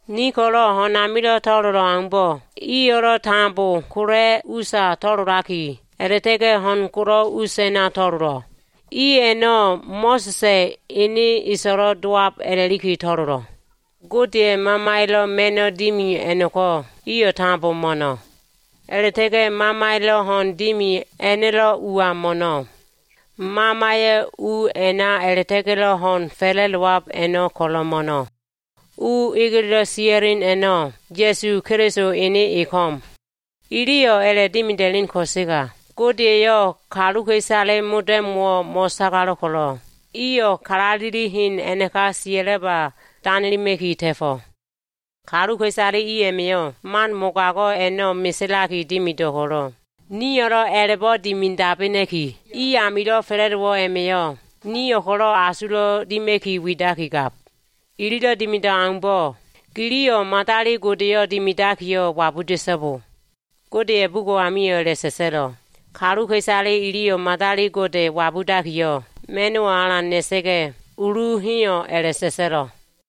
Ni ko꞉lo꞉ ho꞉n amilo꞉ to꞉lolo꞉ aumbo꞉, iyo꞉lo꞉ tambo kola꞉ usa to꞉lolaki, a꞉la꞉ta꞉ga꞉ ho꞉n golo꞉ us a꞉na to꞉lolo꞉. I a꞉no꞉ Mo꞉sa꞉sa꞉ ene e so꞉lo꞉l dowab a꞉la꞉liki to꞉lolo꞉. Godeya꞉ Mamaya꞉lo꞉ ma꞉no꞉ dimi a꞉no꞉ko꞉ iyo꞉ tambo mo꞉no꞉. A꞉la꞉ta꞉ga꞉ Mamaya꞉lo꞉ ho꞉n dimi a꞉no꞉lo꞉ ua mo꞉no꞉. Mamaya꞉ u a꞉na a꞉la꞉ta꞉ga꞉lo꞉ ho꞉n fa꞉la꞉dowab a꞉no꞉ ko꞉lo꞉ mo꞉no꞉. U egeledo꞉ sia꞉len a꞉no꞉, Ya꞉su Keliso ene e ko꞉m. Iliyo꞉ a꞉la꞉dimida꞉len ko꞉sega, Gode eyo꞉ kaluka꞉isale modo꞉mo꞉wo꞉ mo꞉sagalo꞉ ko꞉lo꞉, iyo꞉ kalaleli hen a꞉naka sia꞉laba danelima꞉ki ta꞉fo꞉. Kaluka꞉isale i a꞉ma꞉yo꞉ man mogago꞉ a꞉no꞉ meselaki dimido꞉ ko꞉lo꞉, nio꞉lo꞉ a꞉la꞉bo꞉ dimidabena꞉ki, i amilo꞉ fa꞉la꞉dowo꞉ a꞉ma꞉yo꞉ nio꞉ ko꞉lo꞉ asulo꞉wo꞉ dima꞉ki widakigab. Ililo꞉ dimido꞉ aumbo꞉ giliyo꞉ madali godeyo꞉ dimidakiyo꞉ wabuda꞉so꞉bo. Godeya꞉ bugo꞉ amio꞉ a꞉la꞉sa꞉sa꞉lo꞉, “Kaluka꞉isale iliyo꞉ madali gode wabudakiyo꞉, ma꞉n o꞉lia꞉ ho꞉n o꞉lia꞉yo꞉ alan na꞉likiyo꞉ ulu heyo꞉” a꞉la꞉sa꞉sa꞉lo꞉.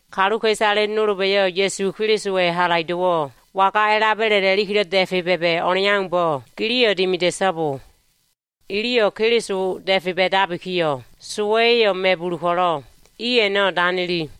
Kaluka꞉isale nolba꞉lo꞉ Ya꞉su Kelisowa꞉ halaido꞉wo꞉ waga a꞉laba꞉le a꞉lakilo꞉ da꞉fe ba꞉ba꞉ o꞉leaumbo꞉ giliyo꞉ dimida꞉so꞉bo. Iliyo꞉ Keliso da꞉fe ba꞉dabikiyo꞉, sowa꞉ya꞉yo꞉ ma꞉bulu ko꞉lo꞉, i a꞉no꞉ danili.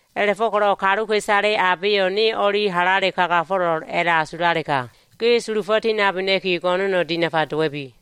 A꞉la꞉fo꞉ko꞉lo꞉ kaluka꞉isale abeyo꞉ ne o꞉li halale kagafo꞉lo꞉l a꞉la꞉asulalega, ge sulufo꞉ tinabena꞉ki, go꞉no꞉no꞉ dinafa dowa꞉bi.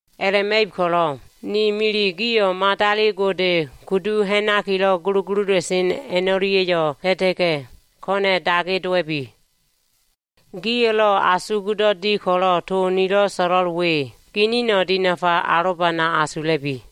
A꞉la꞉ma꞉ib ko꞉lo꞉, ni milile gio꞉ madali gode kudu ha꞉nakilo꞉ gulugulula꞉sen a꞉no꞉lia꞉yo꞉ ta꞉ta꞉ga꞉, ko꞉na꞉ dage dowa꞉bi. Gio꞉lo꞉ asugdo꞉ di ko꞉lo꞉ to nilo꞉ so꞉lo꞉l we ginino꞉ dinafa alobana asula꞉bi.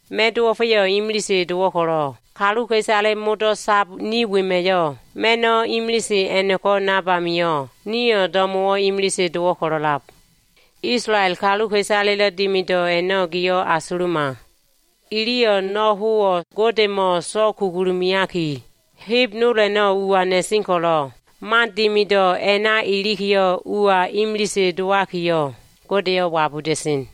Ma꞉n dowo꞉fa꞉yo꞉ imilise dowo꞉ ko꞉lo꞉, kaluka꞉isale modo꞉ sab ni wema꞉yo꞉ ma꞉no꞉ imilise a꞉no꞉ko꞉ nab amio꞉, nio꞉ do꞉mo꞉wo꞉ imilise dowo꞉ ko꞉lo꞉lab. Isolael kaluka꞉isaleya꞉lo꞉ dimido꞉ a꞉no꞉ gio꞉ asuluma. Iliyo꞉ no꞉ howo꞉ Godemo꞉ so꞉kugulu meaki, heb nol a꞉no꞉ ua na꞉sen ko꞉lo꞉, man dimido꞉ a꞉na ilikiyo꞉, ua imilise dowakiyo꞉, Godeyo꞉ wabuda꞉sen.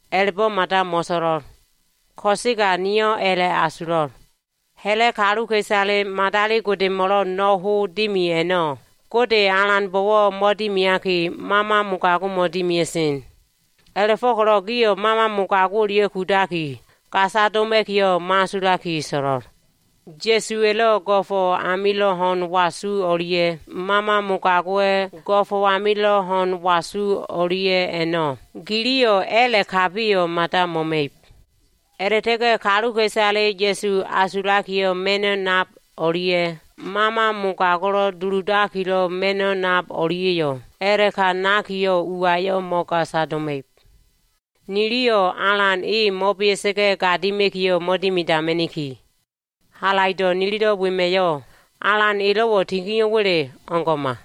A꞉la꞉bo꞉ mada mo꞉so꞉lo꞉l. Ko꞉sega niyo꞉ a꞉la꞉so꞉lo꞉l. Ha꞉la꞉ kaluka꞉isale madali godemo꞉lo꞉ no꞉ ho dimi a꞉no꞉, Gode Alanbo꞉wo꞉ mo꞉dimiaki, mama mogago꞉mo꞉ dimia꞉sen. A꞉la꞉fo꞉ko꞉lo꞉ gio꞉ mama mogago꞉ o꞉lia꞉ kudaki gasa doma꞉kiyo꞉ mo꞉asulaki so꞉lo꞉l. Ya꞉suwa꞉lo꞉ go꞉fo꞉ amilo꞉ ho꞉n wasu o꞉lia꞉ mama mogago꞉wa꞉ go꞉fo꞉ amilo꞉ ho꞉n wasu o꞉lia꞉ a꞉no꞉ giliyo꞉ a꞉la꞉kabiyo꞉ mada mo꞉ma꞉ib. A꞉la꞉ta꞉ga꞉ kaluka꞉isale Ya꞉su asulakilo꞉ ma꞉no꞉ nab o꞉lia꞉, mama mogago꞉lo꞉ duludakilo꞉ ma꞉no꞉ nab o꞉lia꞉yo꞉, a꞉la꞉ka nakiyo꞉ uayo꞉ mo꞉gasa doma꞉ib. Niliyo꞉ Alan e mo꞉bea꞉sa꞉ga꞉ gadima꞉kiyo꞉ mo꞉dimidama꞉niki. Halaido꞉ nilido꞉ wema꞉yo꞉, Alan elo꞉wo꞉ tinio꞉wa꞉le? O꞉ngo꞉ma!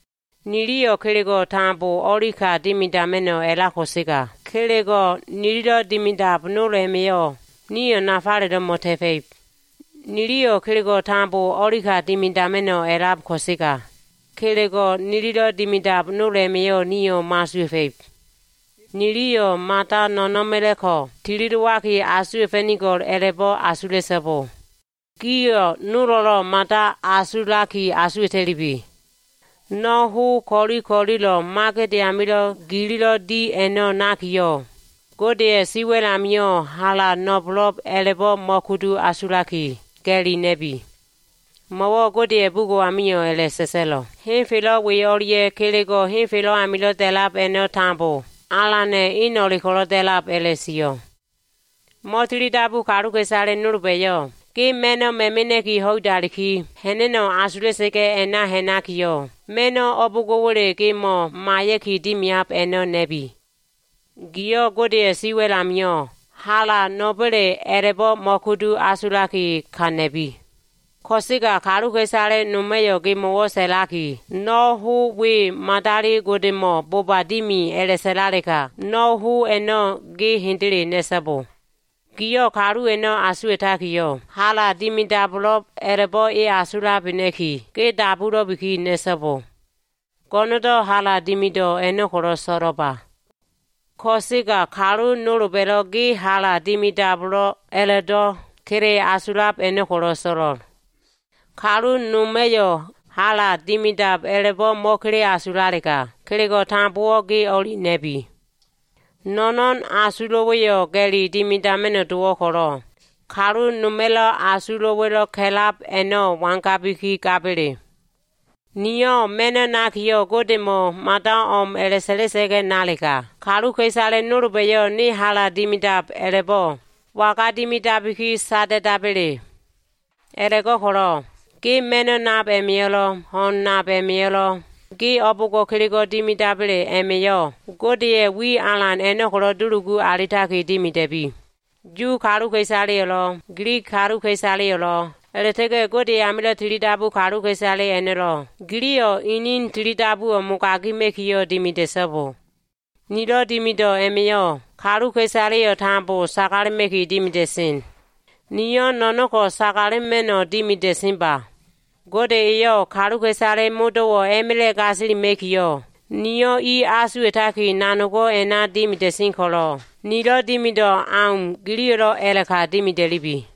Niliyo꞉ kelego꞉ tambo o꞉li ka dimidama꞉no꞉ a꞉lab ko꞉sega, kelego꞉ nililo꞉ dimidab nol a꞉ma꞉yo꞉ nio꞉ nafalelo꞉ mo꞉ta꞉fa꞉ib. Niliyo꞉ kelego꞉ tambowo꞉ o꞉li ka dimidama꞉no꞉ a꞉lab ko꞉sega, kelego꞉ nililo꞉ dimidab nol a꞉ma꞉yo꞉ nio꞉ mo꞉asuwa꞉fa꞉ib. Niliyo꞉ mada no꞉no꞉na꞉ma꞉la꞉ ko꞉ tilidowaki asuwa꞉fa꞉nigo꞉l a꞉la꞉bo꞉ asula꞉so꞉bo. Giliyo꞉ nolo꞉lo꞉ mada asulaki asuwa꞉ta꞉lubi. No꞉ ho ko꞉li ko꞉lilo꞉ magede amilo꞉ gilo꞉ di a꞉no꞉ nakiyo꞉, Godeya꞉ siwa꞉l amio꞉ hala no꞉bo꞉lo꞉b a꞉la꞉bo꞉ mo꞉kudu asulaki, ga꞉li na꞉bi. Mo꞉wo꞉ Godeya꞉ bugo꞉ amio꞉ a꞉la꞉sa꞉sa꞉lo꞉, “Henfelo꞉ we o꞉lia꞉ kelego꞉ henfelo꞉ a꞉namilo꞉ da꞉labo꞉ a꞉no꞉ tambo Alana꞉ eno꞉le ko꞉lo꞉ da꞉lab” a꞉la꞉sio꞉. Mo꞉tili dabu kaluka꞉isale nolba꞉yo꞉ ge ma꞉no꞉ ma꞉mena꞉ki ho꞉idaliki ha꞉na꞉no꞉ asula꞉sa꞉ga꞉ a꞉na ha꞉nakiyo꞉, ma꞉no꞉ o꞉bo꞉ngo꞉wa꞉le gemo꞉ maiya꞉ki dimiab a꞉no꞉ na꞉bi. Giyo꞉ Godeya꞉ siwa꞉l amio꞉ hala no꞉ba꞉le a꞉la꞉bo꞉ mo꞉kudu asulaki, ka na꞉bi. Ko꞉sega kaluka꞉isale noma꞉yo꞉ gemo꞉wo꞉ sa꞉laki, “No꞉ ho we madali godemo꞉ boba dimi” a꞉la꞉sa꞉lalega, no꞉ ho a꞉no꞉ ge hendele na꞉so꞉bo. Giyo꞉ kalu a꞉no꞉ asuwa꞉takiyo꞉, hala dimidabo꞉lo꞉b a꞉la꞉bo꞉ e asulabena꞉ki, ge dabulo꞉biki na꞉so꞉bo. Go꞉no꞉ndo꞉ hala dimido꞉ a꞉no꞉ ko꞉lo꞉ so꞉lo꞉ba. Ko꞉sega kalu nolba꞉lo꞉ ge hala dimidabo꞉lo꞉b a꞉la꞉do꞉ kele asulab a꞉no꞉ ko꞉lo꞉ so꞉lo꞉l. Kalu noma꞉yo꞉ hala dimidab a꞉labo꞉ mo꞉kele asulalega, kelego꞉ tambowo꞉ ge o꞉li na꞉bi. No꞉no꞉n asulo꞉wa꞉yo꞉ ga꞉li dimidama꞉no꞉ dowo꞉ ko꞉lo꞉, kalu noma꞉ asulo꞉wa꞉lo꞉ ka꞉lab a꞉no꞉ wangabiki gaba꞉le? Niyo꞉ ma꞉no꞉ nakiyo꞉, Godemo꞉wo꞉ mada o꞉m a꞉la꞉sa꞉la꞉sa꞉ga꞉ nalega, kaluka꞉isale nolba꞉yo꞉ ne hala dimidab a꞉la꞉bo꞉ waga dimidabiki sada꞉daba꞉le? A꞉la꞉go꞉ko꞉lo꞉ ge ma꞉no꞉ nab a꞉ma꞉yo꞉lo꞉, ho꞉n nab a꞉ma꞉yo꞉lo꞉, gi o꞉bo꞉ngo꞉ kelego꞉ dimidaba꞉le a꞉ma꞉yo꞉ Godeya꞉ wi alan a꞉no꞉ ko꞉lo꞉ dulugu alitaki dimida꞉bi. Yu kaluka꞉isaleyo꞉lo꞉, Gilig kaluka꞉isaleyo꞉lo꞉, a꞉la꞉ta꞉ga꞉ Gode amilo꞉ tilidabu kaluka꞉isale a꞉no꞉lo꞉, giliyo꞉ ini tilidabuwo꞉ mogagima꞉kiyo꞉ dimida꞉so꞉bo. Nilo꞉ dimido꞉ a꞉ma꞉yo꞉ kaluka꞉isaleyo꞉ tambo sagalema꞉ki dimida꞉sen. Niyo꞉ no꞉no꞉ ko꞉ sagalema꞉no꞉ dimida꞉senba. Gode eyo꞉ kaluka꞉isale modo꞉wo꞉ a꞉ma꞉la꞉ gasilima꞉kiyo꞉, niyo꞉ i asuwa꞉taki nanogo꞉ a꞉na dimida꞉sen ko꞉lo꞉, nilo꞉ dimido꞉ au, giliyo꞉lo꞉ a꞉la꞉ka dimida꞉lubi.